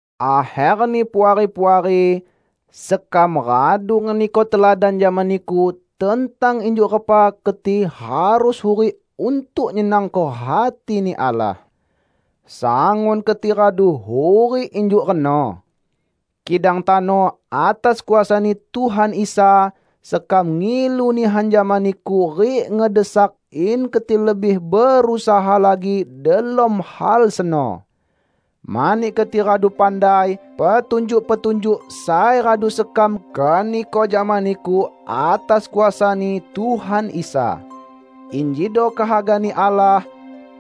Akherni Puari-puari, sekam radu ngeniko teladan jama niku tentang injuk repa keti harus hurik untuk nyenangko hati-Ni Allah. Sangun keti radu hurik injuk reno. Kidang tano atas kuasa-Ni Tuhan Isa, sekam ngilu nihan jama niku rik ngedesak in keti lebih berusaha lagi delom hal seno! Mani keti radu pandai petunjuk-petunjuk sai radu sekam keniko jama niku atas kuasa-Ni Tuhan Isa. Injido kehaga-Ni Allah: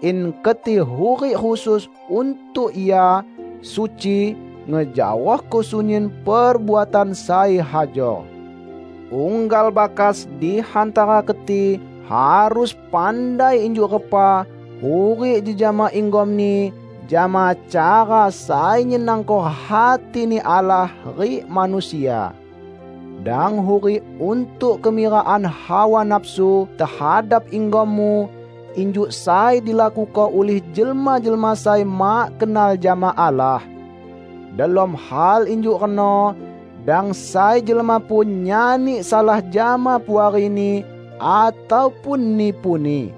In keti hurik khusus untuk Ia, suci, ngejaohko sunyin perbuatan sai hajor. Unggal bakas di hantara keti harus pandai injuk repa hurik jejama inggomni jama cara sai nyenangko hati-Ni Allah rik manusia. Dang hurik untuk kemirakan hawa nafsu tehadap inggommu, injuk sai dilakuko ulih jelma-jelma sai mak kenal jama Allah. Delom hal injuk reno, dang sai jelma pun nyani salah jama puarini ataupun nipuni.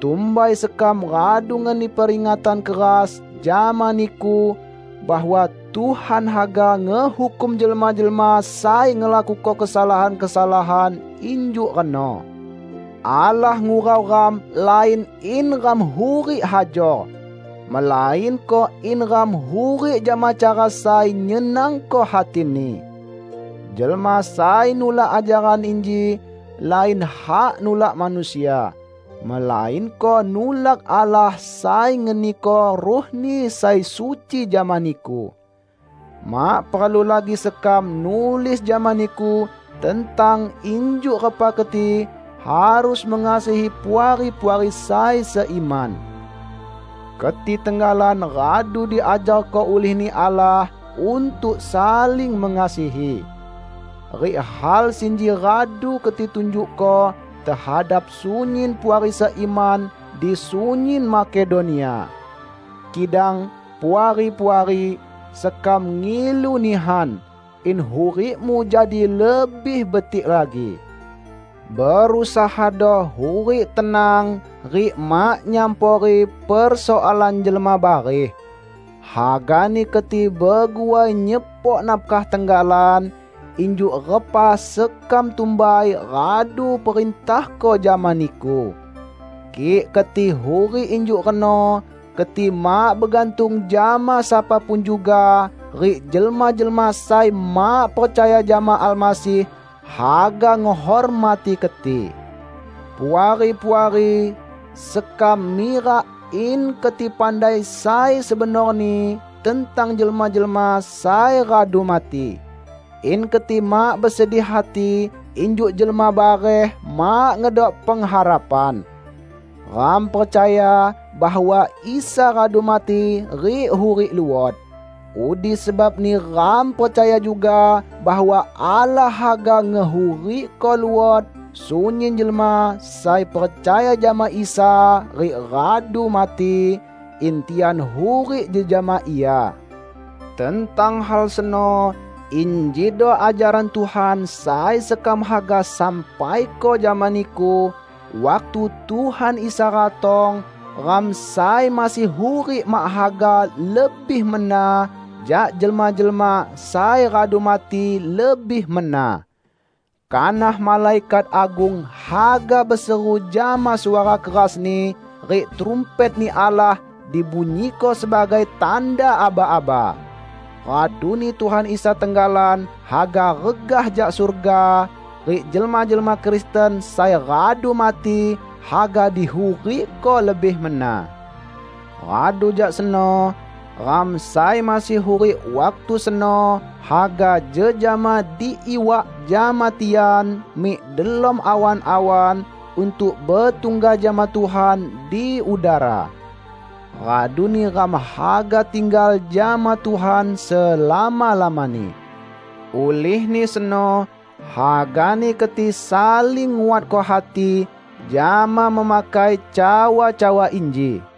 Tumbai sekam radu ngeni peringatan keras jama niku, bahwa Tuhan haga ngehukum jelma-jelma sai ngelakuko kesalahan-kesalahan injuk reno. Allah ngurau ram lain in ram hurik hajor, melainko in ram hurik jama cara sai nyenangko hati-Ni. Jelma sai nulak ajaran inji, lain hak nulak manusia, melainko nulak Allah sai ngeniko Ruh-Ni sai suci jama niku. Mak perlu lagi sekam nulis jama niku tentang injuk repa keti harus mengasihi puari-puari sai seiman. Keti tenggalan radu diajarko ulih-Ni Allah untuk saling mengasihi. Rik hal sinji radu keti tunjukko tehadap sunyin puari seiman di sunyin Makedonia. Kidang, Puari-puari, sekam ngilu nihan, in hurikmu jadi lebih betik lagi. Berusahado hurik tenang rik mak nyampori persoalan jelma barih. Hagani keti beguai nyepok nafkah tenggalan, injuk repa sekam tumbai radu perintahko jama niku. Kik keti hurik injuk reno; keti mak begantung jama sapa pun juga, rik jelma-jelma sai mak percaya jama Almasih, haga ngehormati keti. Puari-puari sekam mirak in keti pandai sai sebenorni tentang jelma-jelma sai radu mati; in keti mak besedih hati injuk jelma bareh mak ngedok pengharapan. Ram percaya bahwa Isa radu mati rik hurik luot. Udi sebabni ram percaya juga bahwa Allah haga ngehurikko luot sunyin jelma sai percaya jama Isa rik radu mati, in tian hurik jejama Ia. Tentang hal seno, injido ajaran Tuhan sai sekam haga sampaiko jama niku: Waktu Tuhan Isa ratong, ram sai masih hurik mak haga lebih mena jak jelma-jelma sai radu mati lebih mena. Kanah malaikat agung haga beseru jama suara kerasni rik trumpet-Ni Allah dibunyiko sebagai tanda aba-aba. Raduni Tuhan Isa tenggalan haga regah jak surga, rik jelma-jelma Kristen sai radu mati haga dihurikko lebih mena. Radu jak seno, ram sai masih hurik waktu seno haga jejama diiwak jama tian mik delom awan-awan untuk betungga jama Tuhan di udara. Raduni ram haga tinggal jama Tuhan selama-lamani. Ulihni seno hagani keti saling nguatko hati jama memakai cawa-cawa inji.